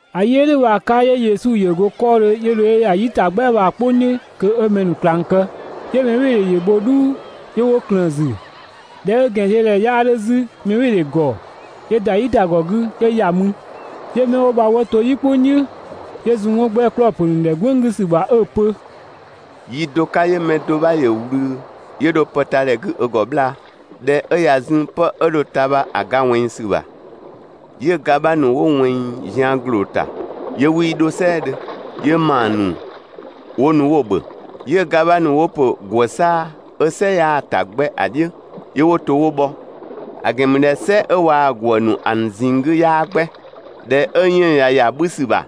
‑A yi 'ö "dhʋ̈ bha‑ 'ka 'yö Yesu ‑yö go 'kɔɔdhö 'yö dho 'yö ‑ya "yitagbɛa bha‑ "kpʋng "dhiʋ̈ kö 'ö mɛ ‑nu ꞊klang kë. 'Yö mɛbhɩɩdhe ‑yö bho "dhuu 'yö 'wo ꞊klëën‑ ‑zü. ꞊Dhɛ 'ö ‑gɛnziödhɛ 'bha 'yaa 'dhö 'zü mɛbhɩɩdhe ‑gɔ, 'yö ‑da "yitagɔ 'gü 'yö ‑ya mü. 'Yö 'mɛ 'wo bha 'wo to "yi "kpʋng "dhiʋ̈, 'yö zun 'wɔn 'gbɛ 'klɔɔ‑ ‑pö ‑nu ‑dhɛ "gwënng 'gü ‑sü ‑bha 'ö‑ pö: «Yi do 'ka 'yö mɛ do 'bha ‑yö ꞊wlü 'yö dho pë ta ‑dhɛ 'gü ö ‑gɔ 'bhlaa. ꞊Dhɛ 'ö ꞊ya zun 'pë 'ö dho‑ ta bha‑ ga ꞊wɛnng ‑sü ‑bha, 'yö‑ ga 'bha ‑nu 'wo ꞊wɛnng zian ‑gloo ‑ta ('yö 'wii 'dho "sɛɛdhö), 'yö ‑maa ‑nu 'wo nu 'wo‑ ‑bhö. 'Yö‑ ga 'bha ‑nu 'wo ‑pö ‑gwë 'saa‑ 'ö "sɛ 'yaa‑ ‑ta 'gbɛ ‑a "dhiʋ̈, 'yö 'wo to 'wo bhɔ, ‑a ‑gɛn ‑mü ꞊dhɛ "sɛ 'ö waa‑ ‑gwë ‑nu ‑a ‑nu ꞊zinng 'gü 'yaa 'gbɛ. ꞊Dhɛ 'ö 'yënng‑ ꞊ya ‑ya 'bhü ‑sü ‑bha,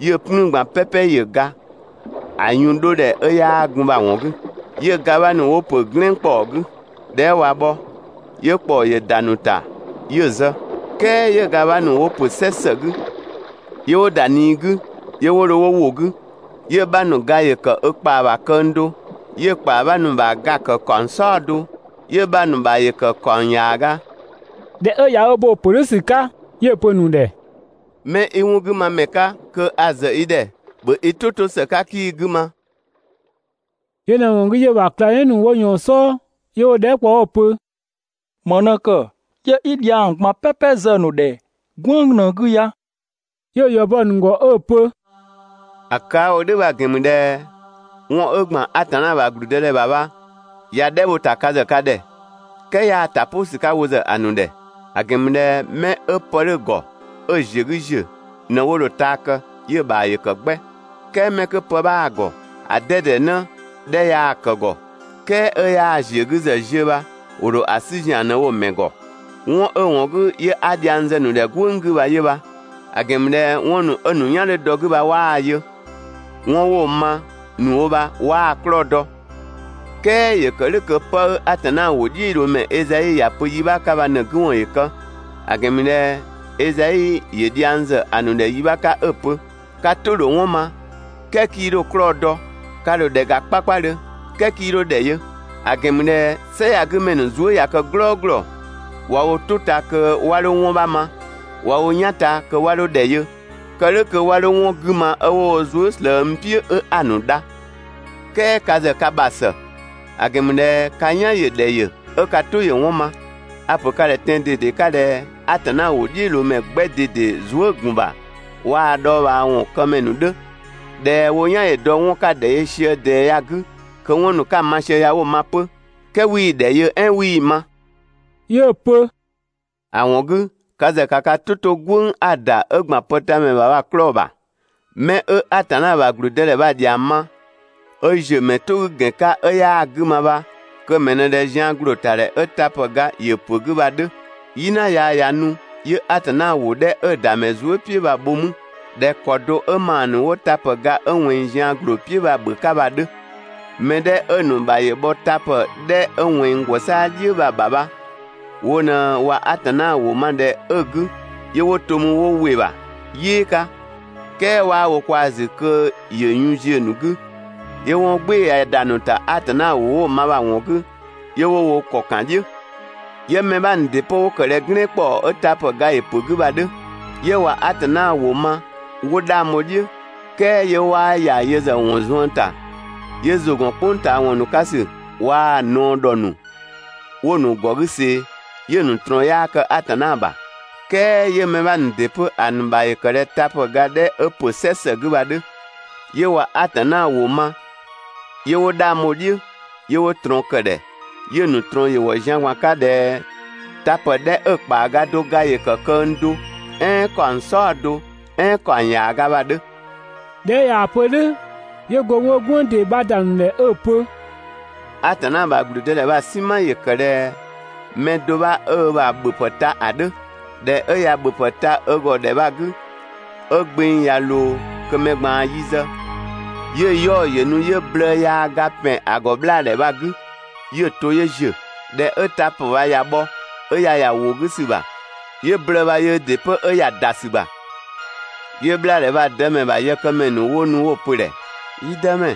'yö‑ "plüün ꞊gban "pɛpɛ ‑yö ga, ‑a yun 'dho ‑dhɛ 'ö 'yaa gun bha‑ ‑wɔn 'gü. 'Yö‑ ga 'bha ‑nu 'wo ‑pö "glɛɛn ‑kpɔɔ 'gü. ꞊Dhɛ 'ö ꞊wa bhɔ, 'yö ‑kpɔɔ ‑yö ‑da ‑nu ‑ta 'yö‑ zë. "Kɛɛ 'yö‑ ga 'bha ‑nu 'wo ‑pö "sɛ ‑së 'gü, 'yö 'wo ‑da ꞊nii 'gü 'yö 'wo dho 'wo ‑wo 'gü, 'yö‑ 'bha ‑nu ga ‑yö ‑kë ö ‑kpaa ‑bha këng do, 'yö‑ ‑kpaa 'bha ‑nu bha ga‑ ‑kë ‑kaɔng "saɔdo, 'yö‑ 'bha ‑nu ‑bha ‑yö ‑kë ‑kaɔng ‑yaaga.» ꞊Dhɛ 'ö ꞊ya bo‑ ‑pö "dhʋ̈ ‑sü 'ka 'yö‑ pö‑ ‑nu ‑dhɛ: «'Mɛ 'i 'wɔn 'gü ma ‑mɛ 'ka, kö a‑ zë i ‑dhɛ, (‑bhö i "tʋ 'to ‑së 'ka 'kii‑ 'gü ma).» Yö ꞊në‑ ‑wɔn 'gü 'yö‑ ‑bha ꞊klangdhiʋ̈ ‑nu ‑wo ‑yɔɔn "sɔɔ, 'yö 'wo‑ dhɛɛ" kpɔ 'wo‑ pö: «‑Më ꞊në ‑kë 'yö 'i dhiang ꞊gban "pɛpɛ zë‑ ‑nu ‑dhɛ "gwënng ꞊në‑ 'gü ya?» 'Yö‑ ‑yɔ bɔ‑ ‑nu ‑gɔ 'ö‑ pö: «‑A kë 'a‑ wo "dhʋ̈ bha‑ ‑gɛn ‑mü ꞊dhɛ 'wɔn 'ö ‑gban Atanna ‑bha ‑gblüdëdhɛ ‑bha bha, ꞊ya "dhɛ bho‑ ‑ta ka ‑zë ka ‑dhɛ. "Kɛɛ 'yaa‑ ‑ta "pʋ ‑sü 'ka wo ‑zë ‑a ‑nu ‑dhɛ. ‑A ‑gɛn ‑mü ꞊dhɛ 'mɛ 'ö pë 'dhö‑ ‑gɔ 'ö‑ ‑ziö 'gü ‑ziö ꞊në 'wo dho‑ taa kë, 'yö‑ ‑bha ‑yö ‑kë 'gbɛ "kɛɛ 'mɛ 'kö pë 'bhaa‑ ‑gɔ ‑a 'dɛdɛ 'në 'dhɛ yaa‑ ‑kë ‑gɔ, "kɛɛ 'ö 'yaa‑ ‑ziö 'gü ‑zë ziö bha ‑wo ‑dho ‑a 'sü ‑zian ꞊në‑ wo‑ ‑mɛ ‑gɔ. 'Wɔn 'ö‑ ‑wɔn 'gü 'yö 'a dhiang zë‑ ‑nu ‑dhɛ "gwënng 'gü bha yö bha; ‑a ‑gɛn ‑mü ꞊dhɛ 'wɔn ‑nu 'ö‑ ‑nu "yan 'dhö dɔ‑ 'gü bha 'waa‑ yö. 'Wɔn 'wo‑ ma ‑nu wo bha 'waa‑ 'klɔɔ‑ dɔ. "Kɛɛ ‑yö ‑kë "dhʋ̈ kö 'pë 'ö Atanna ‑wʋdhiʋ̈loomɛ Ezai ‑ya pö yi 'bha 'ka bha ꞊në‑ 'gü ‑wɔn ‑yö kë. ‑A ‑gɛn ‑mü ꞊dhɛ Ezai ‑yö dhiang ‑zë ‑a ‑nu ‑dhɛ yi 'bha 'ka 'ö‑ pö: ‹Ka "tʋ‑ ‑dho 'wɔn ma, "kɛɛ 'kii 'dho‑ 'klɔɔ‑ dɔ, ka ‑dho ‑dhɛ ‑ga 'kpakpadhö, "kɛɛ 'kii 'dho ‑dhɛ yö. ‑A ‑gɛn ‑mü ꞊dhɛ "sɛ ya‑ 'gü ‑mɛ ‑nu zuë" ꞊ya kë "glɔɔglɔ, ꞊wa wo "tʋ ta kö 'wa 'dho 'wɔn 'bha ma, ꞊wa wo "yan ta kö 'wa 'dho ‑dhɛ yö, kë "dhʋ̈ kö 'wa 'dho 'wɔn 'gü ma 'ö 'wo wo zuë" ꞊slëë n "piʋ̈ 'ö 'a‑ ‑nu dha.› "Kɛɛ ka ‑zë ka ‑bha ‑së, ‑a ‑gɛn ‑mü ꞊dhɛ ka "yan ‑yö ‑dhɛ ‑yö 'ö ka "tʋ ‑yö 'wɔn ma. A‑ ‑pö ka ‑dhɛ tɛan‑ ꞊dede 'ka ꞊dhɛ Atanna ‑wʋdhiʋ̈loomɛ 'gbɛ ꞊dede zuë" ‑gun ‑bha waa‑ dhɔɔbhaawɔn këmɛ ‑nu 'dhö, ꞊dhɛ wo "yan ‑yö dɔ 'wɔn 'ka‑ ‑dhɛ yö sië ꞊dɛɛ ya‑ 'gü kö 'wɔn ‑nu 'ka‑ ma sië ya 'wo‑ ma 'pö, "kɛɛ 'wii‑ ‑dhɛ yö "ɛɛn 'wii‑ ma.» 'Yö‑ pö: «‑A ‑wɔn 'gü ka ‑zë ‑ka ka "tʋ 'to "gwënng 'a‑ ‑da 'ö ‑gban pëtamɛ ‑bha bha‑ 'klɔɔ‑ ‑bha. 'Mɛ 'ö Atanna ‑bha ‑gblüdëdhɛ bha‑ ‑dhiang ma 'ö ‑ziö ‑mɛ "tʋ 'gü ‑gɛn 'ka 'ö 'yaa‑ 'gü ma bha kö‑ mɛ ꞊në ꞊dhɛ zian ‑gloo ‑ta ‑dhɛ 'ö ‑mlüga ‑yö ‑pö 'gü bha‑ 'dhö. "Yina yaa ꞊ya nu 'yö Atanna ‑wʋ 'dhɛ 'ö‑ ‑da ‑mɛ zuë" "piʋ̈ bha‑ bho 'mü ꞊dhɛ ‑kɔ do 'ö ‑maa ‑nu 'wo ‑mlüga 'ö ꞊wɛnng zian ‑gloo "piʋ̈ bha‑ ‑bhö 'ka bha‑ 'dhö. Mɛ 'dhɛ 'ö‑ ‑nu ‑bha ‑yö bhɔ ‑mlüga 'dhɛ 'ö ꞊wɛnng ‑gwë 'saa‑ "dhiʋ̈ bha‑ ‑bha bha wo ꞊në ꞊wa Atanna ‑wʋ ma ‑dhɛ 'ö‑ 'gü, 'yö 'wo to 'mü 'wo ‑wɩ ‑bha "yɩɩ 'ka, "kɛɛ 'waa wo kwaa‑ ‑zü kö‑ yun ‑yö ziö‑ ‑nu 'gü, 'yö 'wɔn "gbɩɩ‑ ꞊ya ‑da ‑nu ‑ta Atanna ‑wʋ 'wo‑ ma bha‑ ‑wɔn 'gü, 'yö 'wo wo ‑kɔ ‑kan "dhiʋ̈. 'Yö‑ mɛ 'bha ‑nu ‑dɩ 'pö 'wo ‑kë ꞊dhɛ "glɛɛn ‑kpɔɔ 'ö tapë ga ‑yö ‑pö 'gü bha‑ 'dhö. 'Yö ꞊wa Atanna ‑wʋ ma 'wo 'dhang bho‑ "dhiʋ̈, "kɛɛ 'yö 'waa ‑ya yö ‑zë ‑wɔn zuën ‑ta. 'Yö ‑zʋ ‑gɔn "kpʋng ꞊taa ‑wɔn ‑nu 'ka ‑sü waa‑ ꞊naɔ ‑dhɔ ‑nu 'wo‑ ‑nu ‑gɔ 'gü ꞊see, 'yö‑ ‑nu ꞊trɔɔn 'yaa kë Atanna ‑bha. "Kɛɛ 'yö‑ mɛ 'bha ‑nu ‑dɩ 'pö ‑a ‑nu ‑bha ‑yö ‑kë ꞊dhɛ ‑mlüga 'dhɛ 'ö ‑pö "sɛ ‑së 'gü bha‑ 'dhö. 'Yö ꞊wa Atanna ‑wʋ ma 'yö 'wo 'dhang bho‑ "dhiʋ̈, 'yö 'wo ꞊trɔɔn ‑kë ‑dhɛ 'yö‑ ‑nu ꞊trɔɔn ‑yö ‑wɔ zian ꞊gban 'ka ꞊dhɛ tapë 'dhɛ 'ö‑ ‑kpaaga do ga ‑yö ‑kë këng do "ɛɛn ‑kaɔng "saɔdo "ɛɛn ‑kaɔng ‑yaaga bha‑ 'dhö.» ꞊Dhɛ 'ö ꞊yaa‑ pö "dhʋ̈, 'yö go mü 'ö "gwënng ‑dee 'bha ‑da ‑nu ‑dhɛ 'ö‑ pö: «Atanna ‑bha ‑gblüdëdhɛ bha‑ "sinma ‑yö ‑kë ꞊dhɛ mɛ do 'bha 'ö ö ‑bha ‑bhöpë ta ‑a 'dhö. ꞊Dhɛ 'ö ꞊ya ‑bhöpë ta ö ‑gɔ ‑dhɛ bha‑ 'gü 'ö gbeng ꞊ya ꞊loo kö mɛ ꞊gbaan yi zë, 'yö‑ 'yaɔ‑ ‑yö nu 'yö blëë yaa ga ‑pɛn ‑a ‑gɔ 'bhlaadhɛ bha‑ 'gü 'yö‑ to 'yö ‑ziö. ꞊Dhɛ 'ö tapë bha ꞊ya bhɔ 'ö ꞊ya ‑ya ‑wo 'gü ‑sü ‑bha, 'yö blëë bha yöö ‑dɩ 'pö 'ö ‑ya ‑da ‑sü ‑bha. 'Yö 'bhlaadhɛ bha‑ dëmɛ ‑bha yëkëmɛ ‑nu 'wo nu 'wo‑ pö‑ ‑dhɛ: «Yi dëmɛ,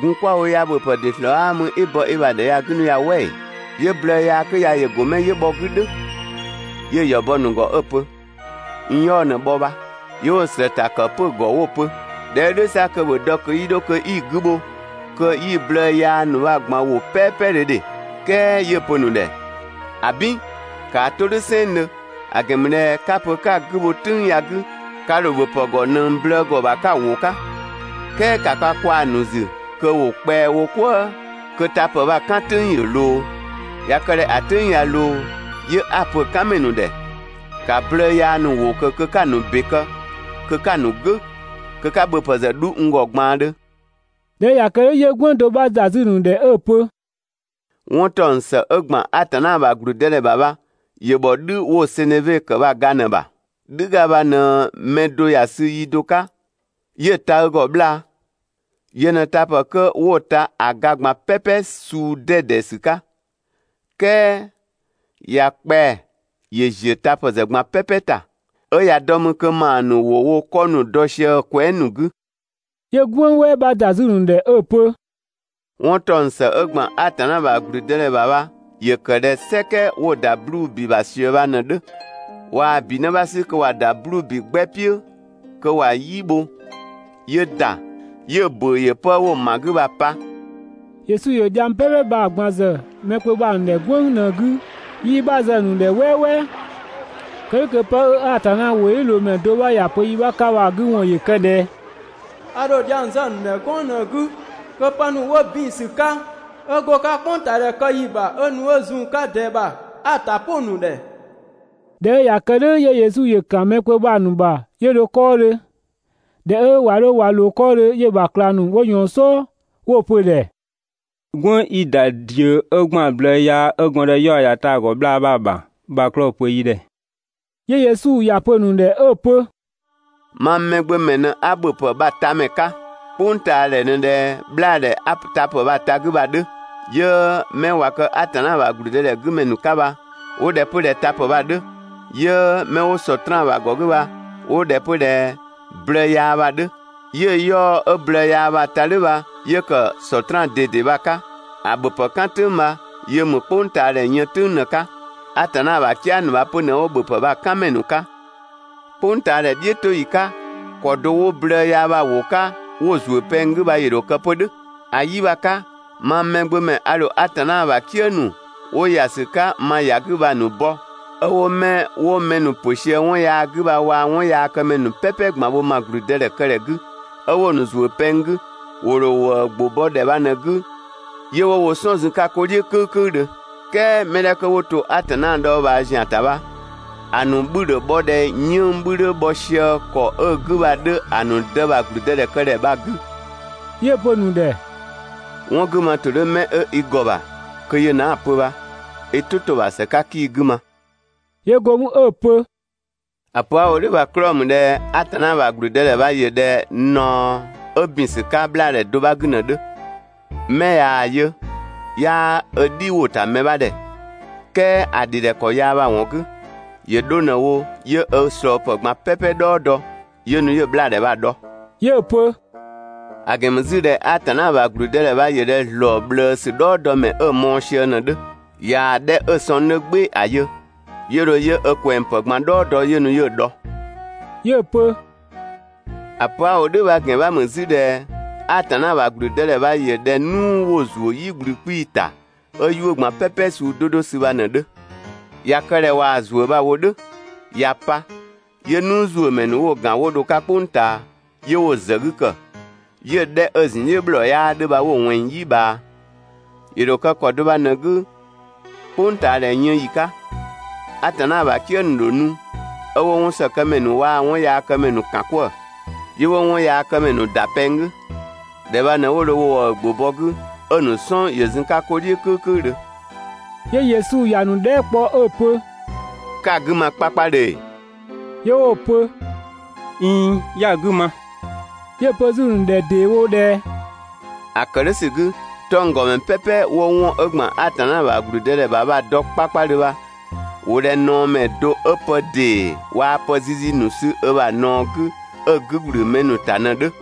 gun 'kwa‑ wo ya, ‑bhöpë ‑dɩ ‑slɔɔ 'aa mü 'i‑ bɔ i ‑bha ‑dhɛ ya 'gü 'nu ya "wɛ ‑ee? 'Yö blëë yaa 'kö ya ‑yö go 'mɛ 'yö bhɔ‑ 'gü "dhʋ̈?» 'Yö‑ ‑yɔ bɔ‑ ‑nu ‑gɔ 'ö‑ pö: «N 'yaɔ‑ ꞊në bhɔ bha.» 'Yö 'wo‑ ‑slëë ‑ta ‑kë 'pö‑ ‑gɔ 'wo‑ pö: ꞊Dhɛ 'ö "dhʋ̈ 'sa kö ‑bhö dɔ kö 'yi 'dho kö 'yi‑ 'gü bho kö 'yi‑ blëë yaa ‑nu bha‑ ꞊gban ‑wo "pɛɛpɛdhö ‑dhe.» "Kɛɛ 'yö‑ pö‑ ‑nu ‑dhɛ: «‑Abin, ‑kaa 'to "dhʋ̈ "sɛnngdhö, ‑a ‑gɛn ‑mü ꞊dhɛ 'ka‑ pö 'ka‑ 'gü bho "tʋ̈ng ya‑ 'gü, ka ‑dho ‑bhöpë ‑gɔ ꞊nëng blëë ‑gɔ ‑bha 'ka‑ ‑wo 'ka. "Kɛɛ ‑ka ka kwaa‑ ‑nu ‑zü kö ‑wo kpɛa‑ wo "kwëë kö tapë bha‑ "kan "tʋ̈ng ‑yö ꞊loo! ꞊Ya kë ꞊dhɛ ‑a "tʋ̈ng ꞊ya ꞊loo, 'yö 'a‑ pö‑ "kanmɛ ‑nu ‑dhɛ: «‑Ka blëë yaa ‑nu ‑wo ꞊kö kö 'ka‑ ‑nu ‑be kë, kö 'ka‑ ‑nu "gʋ̈! Kö 'ka ‑bhöpë ‑zë 'dhu n ‑gɔ ꞊gbaandhö.» ꞊Dhɛ 'ö ꞊ya kë "dhʋ̈ 'yö "gwënng do 'bha ‑da 'zü‑ ‑nu ‑dhɛ 'ö‑ pö: «'Wɔn ‑taɔng ‑së 'ö ‑gban Atanna ‑bha ‑gblüdëdhɛ ‑bha bha ‑yö ‑bhɔ "dhü 'wo‑ seneve ‑kë bha‑ ga ꞊në‑ ‑bha. "Dhüga bha ꞊në mɛ do ‑ya sü yi do 'ka 'yö‑ ta ö ‑gɔ 'bhlaa. Yö ꞊në tapë 'kö 'wo‑ ta ‑a ga ꞊gban "pɛpɛ suu 'dɛdɛ ‑sü 'ka, "kɛɛ ꞊ya kpɛa‑ ‑yö ‑ziö tapë ‑zë ꞊gban "pɛpɛ ‑ta, 'ö ꞊ya dɔ 'mü kö ‑maa ‑nu ‑wo wo 'kɔ ‑nu dɔ sië‑ kwɛɛ" ‑nu 'gü.» 'Yö "gwënng "wɛɛ 'bha ‑da 'zü‑ ‑nu ‑dhɛ 'ö‑ pö: «'Wɔn ‑taɔng ‑së 'ö ‑gban Atanna ‑bha ‑gblüdëdhɛ ‑bha bha ‑yö ‑kë ꞊dhɛ "sɛkɛ 'wo‑ ‑da 'bluubi ‑bha ꞊sië bha ꞊në‑ 'dhö. ꞊Waa‑ ‑bi 'në 'bha 'sü kö ‑wa ‑da 'bluubi 'gbɛ "piʋ̈ kö ‑wa "yi bho 'yö ‑da, 'yö‑ ‑bʋ̈ʋ̈ ‑yö 'pë 'wo‑ ‑ma 'gü bha‑ pa.» Yesu ‑yö dhiang "pɛpɛ bha‑ ꞊gban ‑zë mɛ kpö bha‑ ‑nu ‑dhɛ "gwënng ꞊në‑ 'gü, 'yii‑ 'bha zë‑ ‑nu ‑dhɛ "wɛɛwɛɛ. Kë "dhʋ̈ kö 'pë 'ö Atanna ‑wʋdhiʋ̈loomɛ do 'bha ‑ya pö yi 'bha 'ka bha‑ 'gü ‑wɔn ‑yö kë: «꞊Dhɛ a ‑dho dhiang zë‑ ‑nu ‑dhɛ "gwënng ꞊në‑ 'gü kö pë ‑nu 'wo ‑bin ‑sü 'ka 'ö go‑ 'ka "kpʋngtaadhɛ kë ‑yi ‑bha 'ö nu 'ö zun‑ 'ka ꞊dɛɛ ‑bha bha 'a‑ ‑ta "pʋ‑ ‑nu ‑dhɛ.» ꞊Dhɛ 'ö ꞊ya kë "dhʋ̈ 'yö Yesu ‑yö ‑kan mɛ kpö bha‑ ‑nu ‑bha 'yö dho 'kɔɔdhö. ꞊Dhɛ 'ö ꞊wa 'dho ꞊wa ‑wo 'kɔɔdhö 'yö‑ ‑bha ꞊klang ‑nu 'wo ꞊yɔɔn‑ "sɔɔ 'yö 'wo‑ pö‑ ‑dhɛ: «"Gwënng 'i ‑da ꞊diö 'ö ‑gban blëë yaa 'ö gɔndë 'yaɔ‑ ‑ya ta‑ ‑gɔ 'bhlaa bha‑ ‑bha bha‑ 'klɔɔ‑ pö yi ‑dhɛ!» 'Yö Yesu ‑ya pö‑ ‑nu ‑dhɛ 'ö‑ pö: «Mang Mɛgbömɛ ma ꞊në 'a ‑bhöpë bha‑ tamɛ 'ka. "Kpʋngtaadhɛ ꞊në ꞊dhɛ 'bhlaadhɛ 'a tapë bha ta‑ 'gü bha‑ 'dhö, 'yö mɛ ꞊wa kë Atanna ‑bha ‑gblüdëdhɛ 'gü ‑mɛ ‑nu 'ka bha 'wo ꞊dhɛ 'pö ꞊dhɛ tapë bha‑ 'dhö, 'yö 'mɛ 'wo Sɔtraan ‑bha ‑gɔ 'gü bha 'wo ꞊dhɛ 'pö ꞊dhɛ blëë yaa bha‑ 'dhö. 'Yö‑ 'yaɔ‑ 'ö blëë yaa bha‑ ta "dhʋ̈ bha, 'yö ‑kë ‑a Sɔtraan ꞊dede bha‑ 'ka, ‑a ‑bhöpë "kan "tʋ̈ng bha yö ‑mü "kpʋngtaadhɛ yën "tʋ̈ng ꞊në‑ 'ka. Atanna ‑bha "kië ‑nu bha 'pö ꞊në 'wo ‑bhöpë bha‑ "kanmɛ ‑nu 'ka. "Kpʋngtaadhɛ "dhiʋ̈toyi 'ka ‑kɔ do 'wo blëë yaa bha ‑wo 'ka 'wo‑ ‑zuö pɛng 'gü bha ‑yö ‑dho kë 'pö "dhʋ̈. ‑A 'yi bha‑ 'ka, mang Mɛgbömɛ a ‑dho Atanna ‑bha "kië ‑nu 'wo ‑ya ‑sü 'ka ma ‑ya 'gü bha‑ ‑nu bɔ 'ö 'wo 'mɛ 'wo mɛ ‑nu ‑pö sië 'wɔn yaa 'gü bha waa‑ 'wɔnyaakëmɛ ‑nu "pɛpɛ ꞊gban bho ma ‑gblüdëdhɛkëdhɛ 'gü, 'ö 'wo‑ ‑nu ‑zuö pɛng 'gü, ‑wo ‑dho ‑wëë ‑gbʋ bɔ ‑dhɛ bha ꞊në‑ 'gü 'yö 'wo wo "sɔn zun‑ 'ka 'ko "dhiʋ̈ "kʋ̈ükʋ̈üdhö. "Kɛɛ mɛ 'dhɛ 'kö 'wo to Atanna dhɔɔbhaa ‑zian ‑ta bha, ‑a ‑nu 'bhü ‑dho bhɔ ꞊dhɛ 'yënng‑ 'bhü 'dhö bhɔ ꞊sië ‑kɔ 'ö‑ 'gü bha‑ 'dhö ‑a ‑nu Dë ‑bha ‑gblüdëdhɛkëdhɛ bha‑ 'gü.» 'Yö‑ pö‑ ‑nu ‑dhɛ: «'Wɔn 'gü ma ‑tʋ 'dhö 'mɛ 'ö i ‑gɔ ‑bha kö yö ꞊në 'a‑ pö bha (i "tʋ 'to‑ ‑bha ‑së 'ka 'kii‑ 'gü ma).» 'Yö go mü 'ö‑ pö: «‑A pö 'a‑ wo "dhʋ̈ bha‑ 'klɔɔ‑ ‑mü ꞊dhɛ Atanna ‑bha ‑gblüdëdhɛ bha ‑yö ꞊dhɛ ꞊naɔ 'ö ‑bin ‑sü 'ka 'bhlaadhɛ do 'bha 'gü ꞊në‑ 'dhö. 'Mɛ ꞊yaa‑ yö, 'yaa ö "dhi ‑wo ‑ta mɛ 'bha ‑dhɛ, "kɛɛ ‑a ‑dhi ‑dhɛ ‑kɔ yaa bha‑ ‑wɔn 'gü, ‑yö 'dho ꞊në wo 'yö ö ꞊slɔɔpë ꞊gban "pɛpɛ "dhɔɔ dɔ 'yö nu 'yö 'bhlaadhɛ bha‑ dhɔ.» 'Yö‑ pö: «‑A ‑gɛn ‑mü 'zü ꞊dhɛ Atanna ‑bha ‑gblüdëdhɛ bha ‑yö ꞊dhɛ ‑zlɔɔ ꞊bhlëësü "dhɔɔdɔmɛ 'ö‑ mɔɔ‑ sië ꞊në‑ 'dhö. ꞊Yaa‑ 'dhɛ 'ö‑ sɔng 'dhö "gbɩɩ‑ ‑a yö, 'yö dho 'yö ö ꞊kwɛngpë ꞊gban "dhɔɔ dɔ 'yö nu 'yö‑ dhɔ.» 'Yö‑ pö: «‑A pö 'a‑ wo "dhʋ̈ bha‑ ‑gɛn 'bha ‑mü 'zü ꞊dhɛ Atanna ‑bha ‑gblüdëdhɛ bha ‑yö ꞊dhɛ "nuu 'wo‑ ‑zuö "yi ꞊gblü 'kpii‑ ‑ta 'ö 'yuʋ̈‑ ꞊gban "pɛpɛ suu 'do 'do sü bha ꞊në‑ 'dhö. ꞊Ya kë ꞊dhɛ ꞊waa‑ ‑zuö bha‑ wo "dhʋ̈ ꞊ya pa, 'yö‑ "nuuzuömɛ ‑nu 'wo‑ ‑gan 'wo dho‑ 'ka "kpʋng ꞊taa 'yö 'wo‑ ‑zë 'gü ‑kë, 'yö‑ 'dhɛ 'ö‑ ‑zun "dhiʋ̈ ‑bhlɔɔ 'yaa 'dhö bha 'wo‑ ꞊wɛnng "yi ꞊bhaa. ‑Yö ‑dho kë ‑kɔ do bha ꞊në‑ 'gü "kpʋngtaadhɛ yën ‑yi 'ka. Atanna ‑bha "kië ‑nu ‑dho nu 'ö 'wo 'wɔnsëkëmɛ ‑nu waa‑ 'wɔnyaakëmɛ ‑nu ‑kan 'kwëë‑. 'Yö 'wo 'wɔnyaakëmɛ ‑nu ‑da pɛng 'gü. ‑Dhɛ bha ꞊në 'wo dho ‑wëë ‑gbʋ bɔ‑ 'gü 'ö‑ ‑nu "sɔn ‑yö zun‑ 'ka 'ko "dhiʋ̈ "kʋ̈ükʋ̈üdhö.» 'Yö Yesu ‑ya ‑nu dhɛɛ" kpɔ 'ö‑ pö: «'Ka‑ 'gü ma 'kpakpadhö ‑ee? 'Yö 'wo‑ pö: «꞊Iin, 'ya‑ 'gü ma.» 'Yö‑ pö 'zü‑ ‑nu ‑dhɛ ‑deewo ꞊dhɛ: «‑A ‑kë "dhʋ̈ ‑sü 'gü, 'tɔnggɔmɛ "pɛpɛ 'wo 'wɔn 'ö ‑gban Atanna ‑bha ‑gblüdëdhɛ ‑bha bha‑ dɔ 'kpakpadhö bha, ‑wo ꞊dhɛ ꞊naɔmɛ do 'ö pë ‑dee waa‑ pë zizi ‑nu sü ö ‑bha ꞊naɔ 'gü 'ö‑ 'gü ꞊gblü mɛ ‑nu ‑ta ꞊në‑ 'dhö.»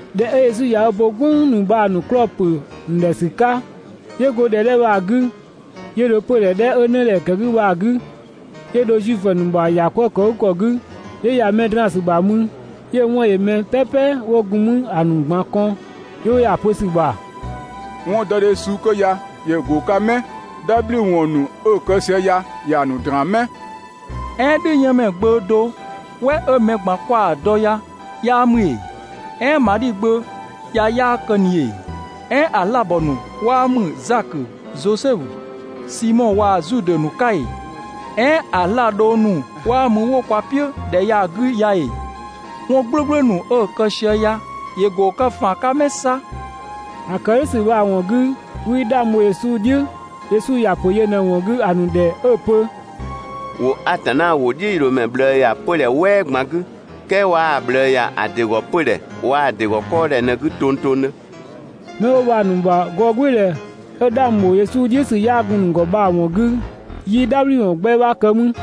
꞊Dhɛ 'ö Yesu ꞊ya ö bo "gwënng ‑nu bha‑ ‑nu 'klɔɔ‑ ‑pö ‑nu ‑dhɛ ‑sü 'ka, 'yö go ‑dhɛ 'dhɛ bha‑ 'gü, 'yö dho 'pödhɛ 'dhɛ 'ö 'nëdhɛ ‑kë 'gü bha‑ 'gü, 'yö dho Zuifö ‑nu ‑bha ‑yakwëëkëgükɔ 'gü 'yö ‑ya mɛ draan‑ ‑sü ‑bha mü. 'Yö‑ 'wɔn ‑yö mɛ "pɛpɛ 'wo gun 'mü ‑a ‑nu ꞊gban kɔn, 'yö 'wo ‑ya pö ‑sü ‑bha: «'Wɔndɔdhe suu 'kö ya ‑yö ‑go ‑a 'ka 'mɛ? "Dhabhliwɔn ‑nu 'ö‑ kë sië ya ‑ya ‑nu ‑draan 'mɛ?» "Ɛɛn "dhüyënmɛ gbö (do "wɛ 'ö mɛ ꞊gban 'kwa‑ dɔ) ya 'yaa ‑mü ‑ee? "Ɛɛn Madhi gbö ya 'yaa kë ꞊ni ‑ee? "Ɛɛn ‑a 'zlaabɔ ‑nu 'waa ‑mü Zakö, Zosɛfu, Simɔ waa‑ Zudë ‑nu 'ka ‑ee? "Ɛɛn ‑a 'zlaa‑ dhong ‑nu 'waa mü 'wo kwa "piʋ̈ ‑dhɛ ya‑ 'gü ya ‑ee? 'Wɔn "gblʋ̈gblʋ̈ ‑nu 'ö‑ kë sië ya ‑yö ‑go kë ‑faan 'ka 'mɛ 'sa?» ‑A ‑kë "dhʋ̈ ‑sü ‑wɔn 'gü 'wii 'dhang bho Yesu "dhiʋ̈. Yesu ‑ya ‑pö yö ꞊në‑ ‑wɔn 'gü ‑a ‑nu ‑dhɛ 'ö‑ pö: «‑Wo Atanna ‑wʋdhiʋ̈loomɛ ꞊bhlëë ‑ya 'pödhɛ "wɛɛ ꞊gban 'gü, "kɛɛ 'waa‑ ꞊bhlëë ‑ya ‑a ‑dɩ ‑gɔ 'pödhɛ waa‑ ‑dɩ ‑gɔ 'kɔɔdhɛ ꞊në‑ 'gü tongtongdhö.» 'Mɛ 'wo bha‑ ‑nu ‑bha gɔɔgbɩɩdhɛ 'ö 'dhang ‑bho Yesu "dhiʋ̈ ‑sü 'yaa gun‑ ‑nu ‑gɔ bha‑ ‑wɔn 'gü 'yii "dhabhliwɔn 'gbɛ 'bha kë mü.